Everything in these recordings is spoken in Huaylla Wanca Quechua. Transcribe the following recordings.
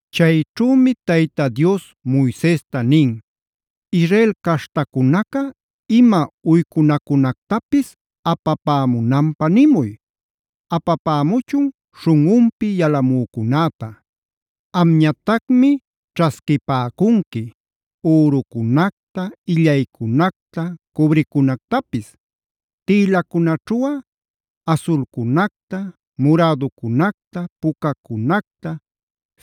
Chayćhümi Tayta Dios Moisesta nin: “Israel caśhtacunaca ima uycunacunactapis apapämunanpä nimuy. Apapämuchun śhunꞌunpi yalamücunäta. Amñatacmi ćhasquipäcunqui: ürucunacta, illaycunacta, cobrecunactapis. Tïlacunaćhuꞌa: asulcunacta, muräducunacta, pucacunacta,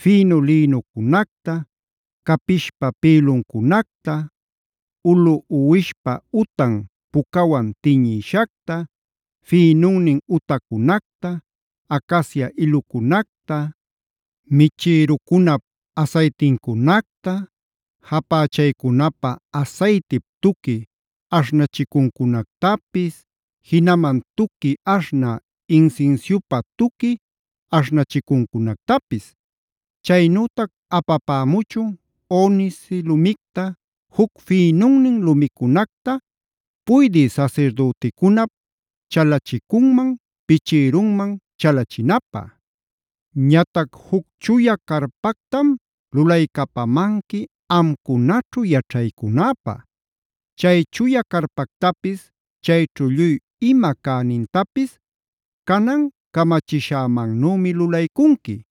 fïnu lïnucunacta, capishpa pïluncunacta, ulu uwishpa utan pucawan tiñïshacta, fïnunnin utacunacta, acacia ilucunacta, michïrucunap asaytincunacta, japächaycunapä asaytip tuqui aśhnachicuncunactapis, jinaman tuqui aśhnä insinsiupä tuqui aśhnachicuncunactapis. Chaynütac apapämuchun: onice lumicta, juc fïnunnin lumicunacta puydï sasirdüticunap chalicunman pichïrunman chalachinapä. Ñatac juc chuya carpactam lulaycapamanqui amcunaćhu yaćhaycunäpä. Chay chuya carpactapis chayćhu lluy ima cänintapis canan camachishämannümi lulaycunqui.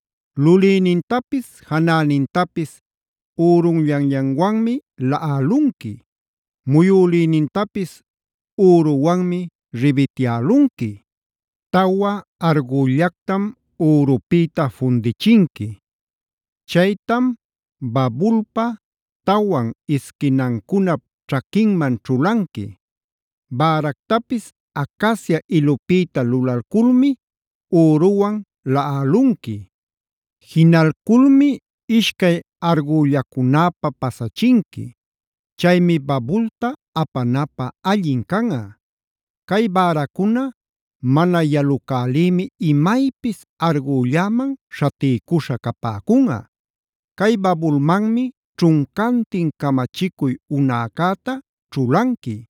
Lulïnintapis janänintapis ürunllanllanwanmi laꞌalunqui. Muyülïnintapis üruwanmi ribityälunqui. Tawa argüllactam ürupïta fundichinqui. Chaytam babulpa tawan isquinancunap ćhaquinman ćhulanqui. Bäractapis acacia ilupïta lulalculmi üruwan laꞌalunqui. Jinalculmi ishcay argüllacunäpä pasachinqui. Chaymi babulta apanapä allin canꞌa. Cay bäracuna mana yalucälïmi imaypis argülläman śhatiycuśha capäcunꞌa. Cay babulmanmi ćhuncantin camachicuy unäcäta ćhulanqui.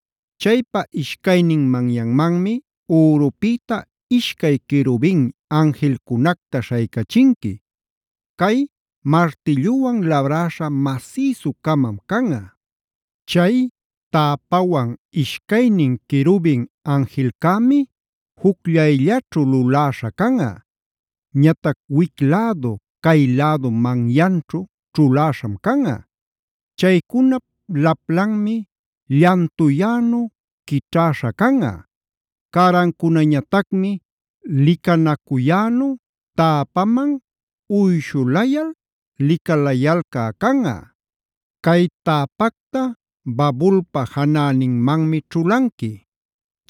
Chaypa ishcaynin manyanmanmi ürupïta ishcay querubin anjilcunacta śhaycachinqui. Cay martilluwan labräśha masïsu-camam canꞌa. Chay täpawan ishcaynin querubin anjilcämi jucllayllaćhu luläśha canꞌa. Ñatac wic-lädu cay-lädu manyanćhu ćhuläśham canꞌa. Chaycunap laplanmi llantuyänu quićhäśha canꞌa. Cärancunañatacmi licanacuyänu täpaman uyshulayal licalayalcä canꞌa. Cay täpacta babulpa janäninmanmi ćhulanqui.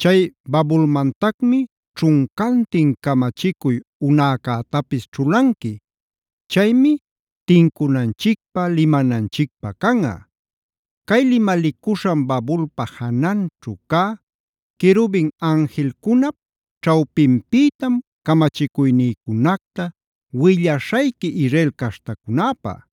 Chay babulmantacmi ćhuncantin camachicuy unäcätapis ćhulanqui. Chaymi tincunanchicpä, limananchicpä canꞌa. Cay limalicuśhan babulpa jananćhu cä querubin anjilcunap ćhawpinpïtam camachicuynïcunacta willaśhayqui Israel caśhtacunäpä.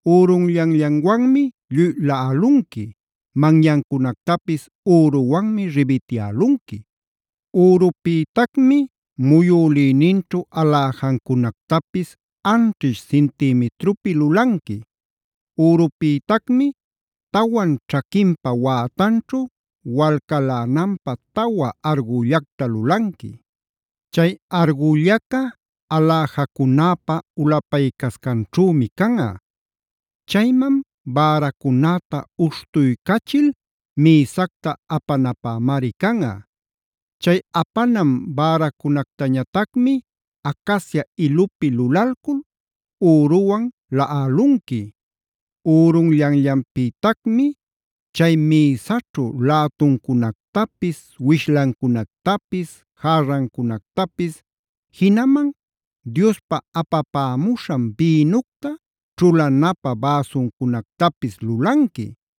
Ürunllanllanwanmi lluy laꞌalunqui, manyancunactapis üruwanmi ribityälunqui. Ürupïtacmi muyülïninćhu aläjancunactapis anćhish cintimitrupi lulanqui. Ürupïtacmi tawan ćhaquinpa wätanćhu walcalänanpä tawa argüllacta lulanqui. Chay argüllaca aläjacunäpa ulapaycascanćhümi canꞌa. Chayman bäracunäta uśhtuycachil mïsacta apanapämari canꞌa. Cay apanan bäracunactañatacmi acacia ilupi lulalcul üruwan laꞌalunqui. Ürunllanllanpïtacmi chay mïsaćhu lätuncunactapis, wishlancunactapis, järrancunactapis, jinaman Diospa apapämuśhan bïnucta ćhulanapä bäsuncunactapis lulanqui.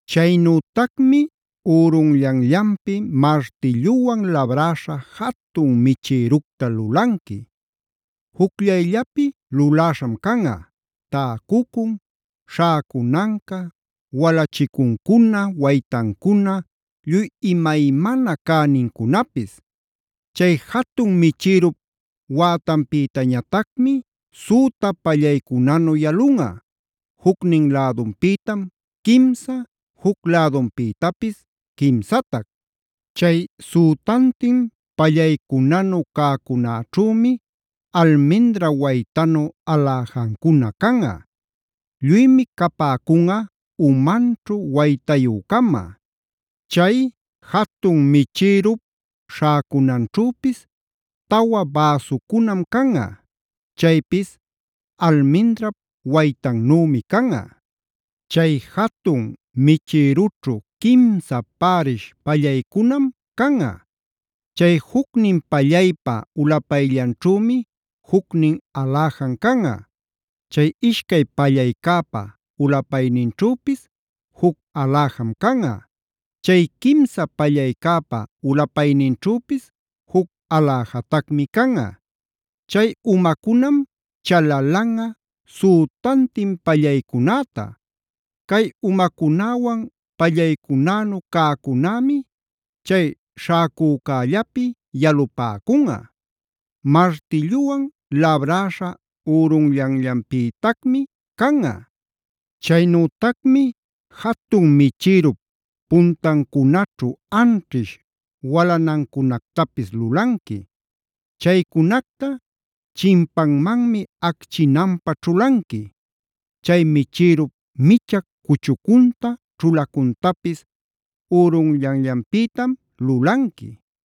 “Chaynütacmi ürunllanllanpi martilluwan labräśha jatun michïructa lulanqui. Jucllayllapi luläśham canꞌa: täcucun, śhäcunanca, walachicuncuna, waytancuna lluy imaymana cänincunapis. Chay jatun michïrup wätanpïtañatacmi süta pallaycunanu yalunꞌa; jucnin lädunpïtam quimsa, juc lädunpïtapis quimsatac. Chay sütantin pallaycunanu cäcunäćhümi almindra waytanu aläjancuna canꞌa. Lluymi capäcunꞌa umanćhu waytayü-cama. Chay jatun michïrup śhäcunanćhüpis tawa bäsucunam canꞌa. Chaypis almindrap waytannümi canꞌa. Chay jatun michïrućhu quimsa pärish pallaycunam canꞌa. Chay jucnin pallaypa ulapayllanćhümi jucnin aläjan canꞌa. Chay ishcay pallaycäpa ulapayninćhüpis juc aläjam canꞌa. Chay quimsa pallaycäpa ulapayninćhüpis juc aläjatacmi canꞌa. Chay umacunam chalalanꞌa sütantin pallaycunäta. Cay umacunäwan pallaycunänu cäcunämi chay śhäcücällapi yalupäcunꞌa. Martilluwan labräśha ürunllanllanpïtacmi canꞌa. Chaynütacmi jatun michïrup puntancunaćhu anćhish walanancunactapis lulanqui. Chaycunacta chimpanmanmi acchinanpä ćhulanqui. Chay michïrup micha cuchucunta, ćhulacuntapis ürunllanllanpïtam lulanqui.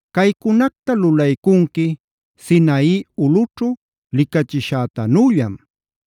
Caycunacta lulaycunqui Sinai ulꞌućhu licachishätanüllam.b